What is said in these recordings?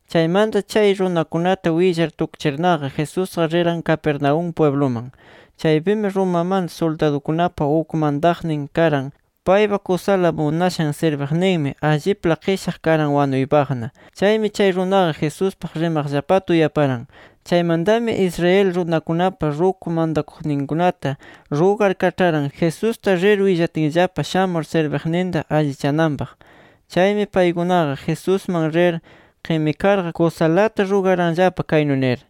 Chaymanta chay runakunata willar tukchirnaqa, Jesusqa riran Capernaúm pwibluman. Chaypimi Romamanta suldadukunapa uk mantaqnin karan. Paypa kusala munashan sirbiqninmi allipla qishaq karan wanuypaqna. Chaymi chay runaqa Jesuspaq rimaqllapata uyaparan. Chaymantami, Israel runakunapa ruku mantakuqninkunata rugar kaĉharan, Jesusta rir willatinllapa shamur sirbiqninta allichananpaq. Chaymi paykunaqa Jesusman rir qimikarqa, kusalata rugaranllapa kaynu nir: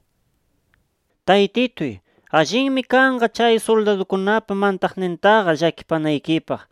—Taytituy, allinmi kanqa chay suldadukunapa mantaqnintaqa llakipanaykipaq.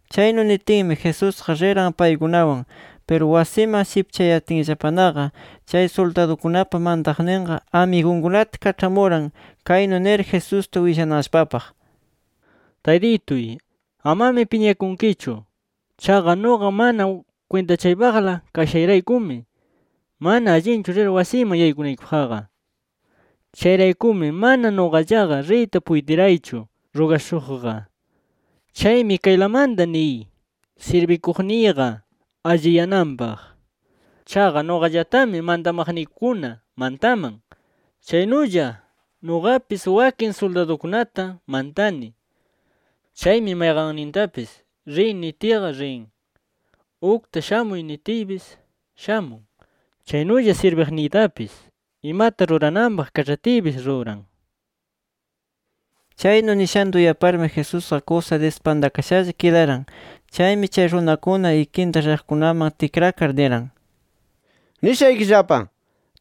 Chaynu nitinmi Jesusqa riran paykunawan. Piru wasiman shipchayatinllapanaqa, chay suldadukunapa mantaqninqa amigunkunata kaĉhamuran kaynu nir Jesusta willananllapapaq: “Taytituy, amami piñakunkichu. Chaqa nuqa mana kwintachaypaqla kashayraykumi, mana allinchu rir wasiyman yaykunaykipaqqa. Chayraykumi mana nuqallaqa riyta puytiraychu rugashuqqa. Chaymi kaylamanta niy, sirbikuqniyqa alliyananpaq. Chaqa nuqallatami mantamaqniykuna mantaman. Chaynulla nuqapis wakin suldadukunata mantani. Chaymi mayqannintapis ‘Riy’ nitiyqa, rin. Ukta ‘Shamuy’ nitiypis, shamun. Chaynulla sirbiqniytapis, imata rurananpaq kaĉhatiypis ruran” nir. Chaynu nishanta uyaparmi Jesusqa kusa dispantakashalla kidaran. Chaymi chay runakuna ikinta riqkunaman tikrakar, niran: —Nishaykillapa: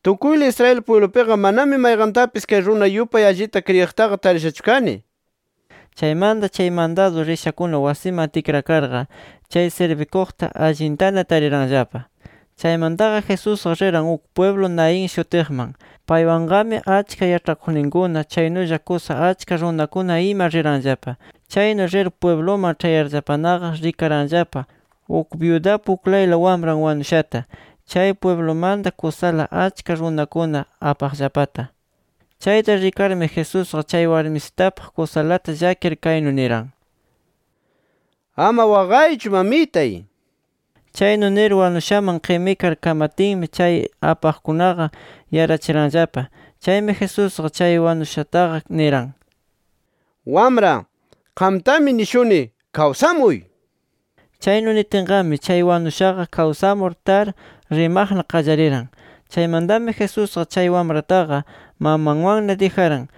Tukuyla Israel pwiblupiqa manami mayqantapis kay runa yupay allita kriyiqtaqa tarishachu kani. Chaymanta chay mandadu rishakuna wasiman tikrakarqa, chay sirbikuqta allintana tariranllapa. Chaymantaqa Jesusqa riran uk pwiblu Naín shutiqman. Paywanqami achka yaĉhakuqninkuna, chaynulla kusa achka runakuna ima riranllapa. Chaynu rir pwibluman ĉhayarllapanaqa rikaranllapa uk byudapa uklayla wamran wanushata chay pwiblumanta kusala achka runakuna apaqllapata. Chayta rikarmi Jesusqa, chay warmisitapaq kusalata llakir kaynu niran: —Ama waqaychu mamitay nir. Chaynu nir wanushaman qimikar kamatinmi, chay apaqkunaqa yarachiranllapa. Chaymi Jesusqa chay wanushataqa niran: —Wamra, qamtami nishuni ¡kawsamuy! nir. Chaynu nitinqami chay wanushaqa kawsamur tar rimaqna qallariran. Chaymantami Jesusqa chay wamrataqa mamanwanna dijaran.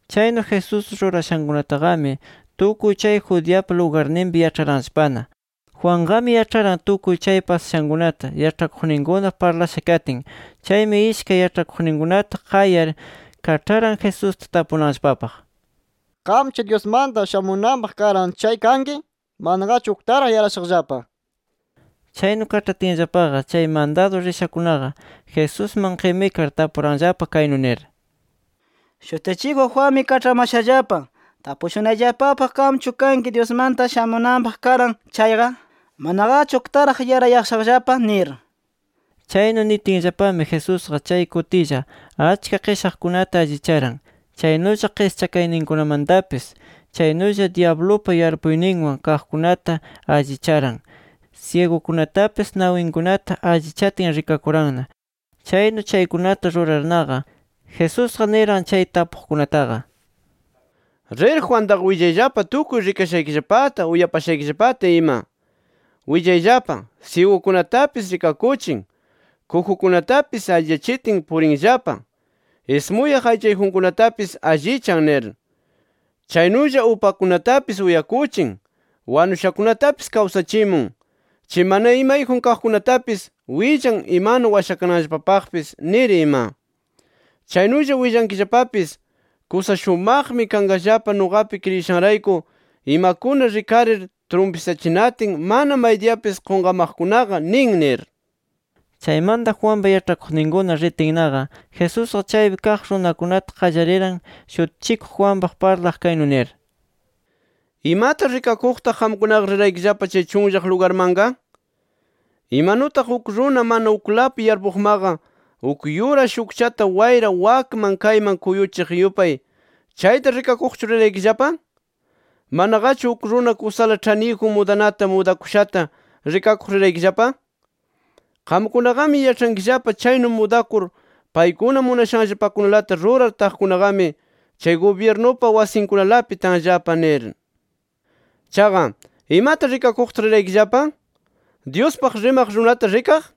Chaynu Jesús rurashankunataqami, tukuy chay Judeapa lugarninpi yaĉharanllapana. Juanqami yaĉharan tukuy chay pasashankunata, yaĉhakuqninkuna parlasha katin. Chaymi ishkay yaĉhakuqninkunata qayar, kaĉharan Jesusta tapunanllapapaq: “Qamchu Dyusmanta shamunanpaq karan chay kanki, manaqachu uktaraq yarayashaqllapa” nir. Chaynu kaĉhatinllapaqa, chay mandadu rishakunaqa Jesusman qimikar tapuranllapa kaynu nir: —Shutichikuq Juanmi kaĉhamashallapa tapushunayllapapaq qamchu kanki Dyusmanta shamunanpaq karan chayqa, manaqachu uktaraq yarayashaqllapa nir. Chaynu nitinllapami, Jesusqa chay kutilla achka qishaqkunata allicharan, chaynulla qischakayninkunamantapis. Chaynulla dyablupa yarpuyninwan kaqkunata allicharan, syigukunatapis nawinkunata allichatin rikakuranna. Chaynu chaykunata rurarnaqa, Jesusqa niran chay tapuqkunataqa: —Rir Juantaqa willayllapa tukuy rikashaykillapata, uyapashaykillapata ima. Willayllapa: Syigukunatapis rikakuchin, kujukunatapis alliyachitin purinllapa, ismuyaq aychayjunkunatapis allichan nir. Chaynulla upakunatapis uyakuchin, wanushakunatapis kawsachimun, chay mana imayjun kaqkunatapis willan imanu washakananllapapaqpis, nir ima. Chaynulla willankillapapis: ¡Kusa shumaqmi kanqallapa nuqapi kriyishanrayku imakuna rikarir trumpisachinatin mana maydiyapis qunqamaqkunaqa nin! nir. Chaymanta Juanpa yaĉhakuqninkuna ritinnaqa, Jesusqa chaypi kaq runakunata qallariran Shutichikuq Juanpaq parlaq, kaynu nir: “¿Imata rikakuqtaq qamkunaqa riraykillapa chay chunllaq lugarmanqa? Imanutaq uk runa mana uklapi yarpuqmaqa uk yura shukchata wayra wakman kayman kuyuchiq yupay, ¿chayta rikakuqchu riraykillapa? ¿Manaqachu uk runa kusala ĉhaniyjun mudanata, mudakushata rikakuq riraykillapa? Qamkunaqami yaĉhankillapa chaynu mudakur paykuna munashanllapakunalata rurar taqkunaqami, chay gubyirnupa wasinkunalapi tanllapa nir. Chaqa, ¿imata rikakuqtaq riraykillapa? ¿Dyuspaq rimaq runata rikaq?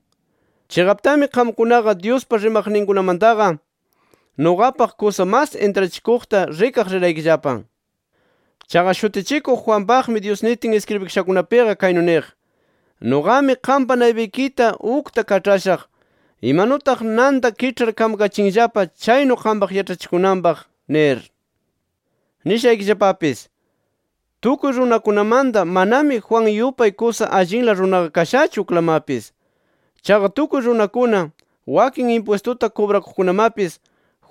Chiqaptami qamkunaqa Dyuspa rimaqninkunamantaqa nuqapaq kusa mas intrachikuqta rikaq riraykillapa. Chaqa Shutichikuq Juanpaqmi, Dyus nitin iskribikashakunapiqa kaynu niq: ‘Nuqami qampa naypaykita ukta kaĉhashaq, imanutaq nanta kiĉhar kamkachinllapa chaynu qampaq yaĉhachikunanpaq’ nir. Nishaykillapapis: Tukuy runakunamanta manami Juan yupay kusa allinla runaqa kashachu uklamapis. Chaqa tukuy runakuna, wakin impwistuta kubrakuqkunamapis,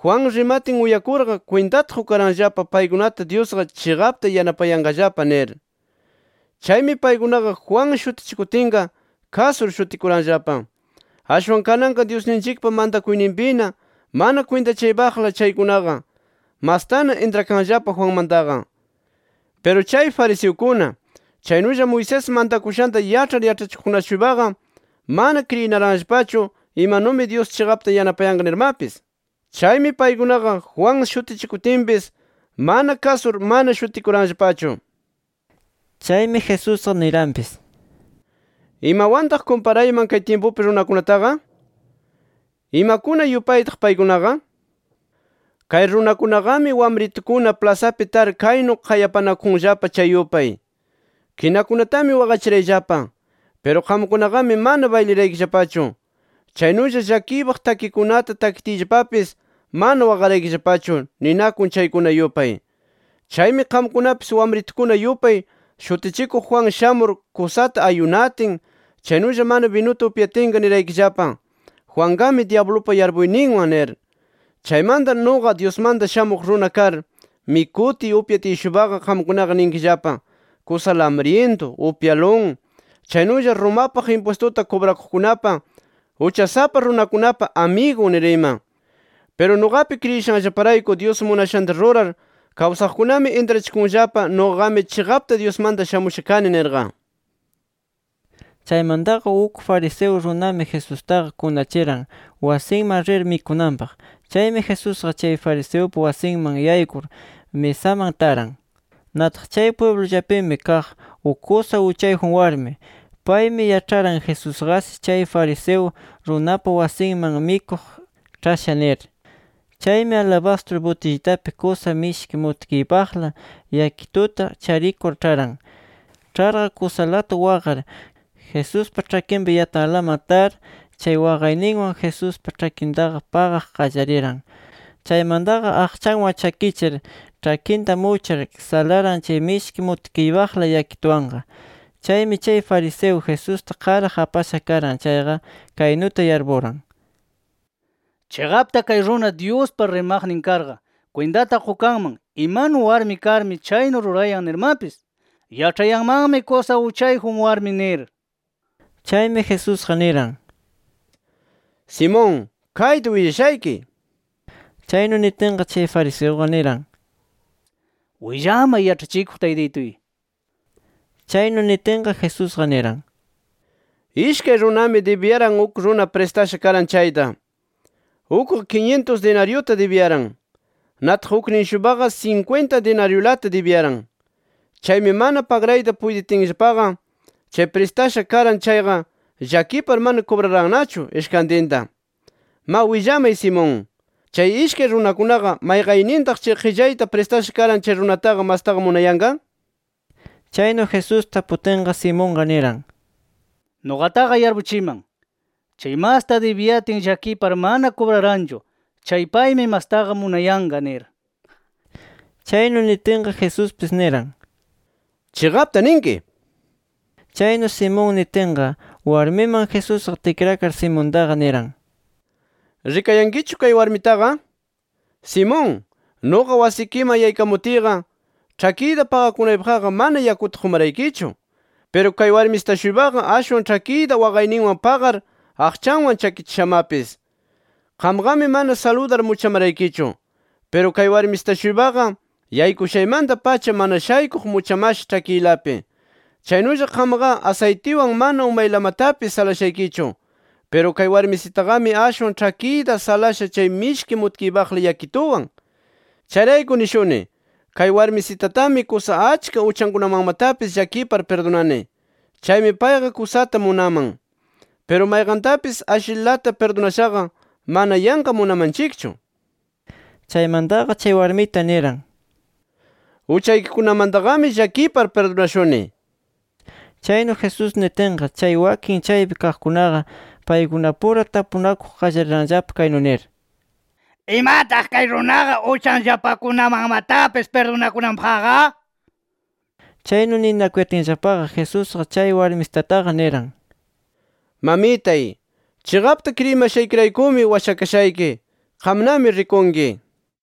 Juan rimatin uyakurqa, kwintata qukaranllapa paykunata Dyusqa chiqapta yanapayanqallapa nir. Chaymi paykunaqa Juan shutichikutinqa, kasur shutikuranllapa. Ashwan kananqa Dyusninchikpa mantakuyninpina mana kwintachaypaqla chaykunaqa, mastana intrakanllapa Juanmantaqa. Piru chay fariseukuna, chaynulla Moisés mantakushanta yaĉhar yaĉhachikuqkuna-shuypaqa, mana kriyinaranllapachu imanumi Dyus chiqapta yanapayanqa nirmapis. Chaymi paykunaqa Juan shutichikutinpis mana kasur mana shutikuranllapachu”. Chaymi Jesusqa niranpis: “¿Imawantaq kumparayman kay tyimpupi runakunataqa? ¿Imakuna yupaytaq paykunaqa? Kay runakunaqami, wamritukuna plasapi tar kaynu qayapanakunllapa chay yupay: ‘Kinakunatami waqachirayllapa. Piru qamkunaqami mana bayliraykillapachu. Chaynulla llakiypaq takikunata takitiyllapapis, mana waqaraykillapachu’ ninakun chaykuna yupay. Chaymi qamkunapis wamritukuna yupay, Shutichikuq Juan shamur kusata ayunatin, chaynulla mana binuta upyatinqa niraykillapa: ‘Juanqami dyablupa yarpuyninwan’ nir. Chaymanta nuqa Dyusmanta Shamuq Runa kar, mikutiy upyatiy-shuypaqa qamkunaqa ninkillapa: ‘Kusala amryintu, upyalun, chaynulla Romapaq impwistuta kubrakuqkunapa, uchasapa runakunapa amigun’ nir ima. Piru nuqapi kriyishanllaparayku Dyus munashanta rurar kawsaqkunami intrachikunllapa nuqaqami chiqapta Dyusmanta shamusha kani nirqa”. Chaymantaqa uk fariseo runami Jesustaqa kunachiran, wasinman rir mikunanpaq. Chaymi Jesusqa chay fariseupa wasinman yaykur misaman taran. Nataq chay pwiblullapimi kaq uk kusa uchayjun warmi. Paymi yaĉharan Jesusqashi chay fariseo runapa wasinman mikuq ĉhasha nir. Chaymi alabastru butillitapi kusa mishki mutkiypaqla yakituta charikur ĉharan. Ĉharqa, kusalata waqar Jesuspa ĉhakinpa yatanlaman tar, chay waqayninwan Jesuspa ĉhakintaqa paqaq qallariran. Chaymantaqa aqchanwan chakichir ĉhakinta muchar salaran chay mishki mutkiypaqla yakituwanqa. Chaymi chay fariseo, Jesusta qaraq apasha karan chayqa, kaynuta yarpuran: Chiqapta kay runa Dyuspa rimaqnin karqa kwintata qukanman, imanu warmi karmi chaynu rurayan nirmapis. Yaĉhayanmanmi kusa uchayjun warmi nir. Chaymi Jesusqa niran: —Simón, kayta willashayki. Chaynu nitinqa, chay fariseuqa niran: —Willamay Yaĉhachikuq Taytituy. Chaynu nitinqa, Jesusqa niran: —Ishkay runami dibiyaran uk runa pristasha karan chayta. Ukqa kinyintus dinaryuta dibiyaran. Nataq uknin-shuypaqa sinkwinta dinaryulata dibiyaran. Chaymi mana pagrayta puytitinllapaqa, chay pristasha karan chayqa llakipar mana kubrarannachu ishkantinta. Ma willamay Simón: ¿Chay ishkay runakunaqa mayqaynintaq chay qillayta pristasha karan chay runataqa mastaqa munayanqa? Chaynu Jesús taputinqa, Simonqa niran: —Nuqataqa yarpuchiman, chay masta dibiyatin llakipar mana kubraranchu chay paymi mastaqa munayanqa nir. Chaynu nitinqa, Jesuspis niran: —Chiqapta ninki. Chaynu Simón nitinqa, warmiman Jesusqa tikrakar Simontaqa niran: —¿Rikayankichu kay warmitaqa? Simón, nuqa wasikiman yaykamutiyqa, ĉhakiyta paqakunaypaqqa mana yakuta qumaraykichu. Piru kay warmisita-shuypaqa, ashwan ĉhakiyta waqayninwan paqar aqchanwan chakichishamapis. Qamqami mana saludar muchamaraykichu. Piru kay warmisita-shuypaqa, yaykushaymanta-pacha mana shaykuq muchamasha ĉhakiylapi. Chaynulla qamqa asaytiwan mana umaylamatapis salashaykichu. Piru kay warmisitaqami, ashwan ĉhakiyta salasha chay mishki mutkiypayla yakituwan. Chayrayku nishuni, kay warmisitatami kusa achka uchankunamanmatapis llakipar pirdunani. Chaymi payqa kusata munaman. Piru mayqantapis ashlilata pirdunashaqa, mana yanqa munamanchikchu. Chaymantaqa chay warmita niran: —Uchaykikunamantaqami llakipar pirdunashuni nir. Chaynu Jesús nitinqa, chay wakin chaypi kaqkunaqa paykunapura tapunakuq qallariranllapa kaynu nir: “¿Imataq kay runaqa uchanllapakunamanmatapis pirdunakunanpaqqa?” Chaynu ninakuyatinllapaqa, Jesusqa chay warmisitataqa niran: —Mamitay, chiqapta kriyimashaykiraykumi washakashayki. Qamnami rikunki nir.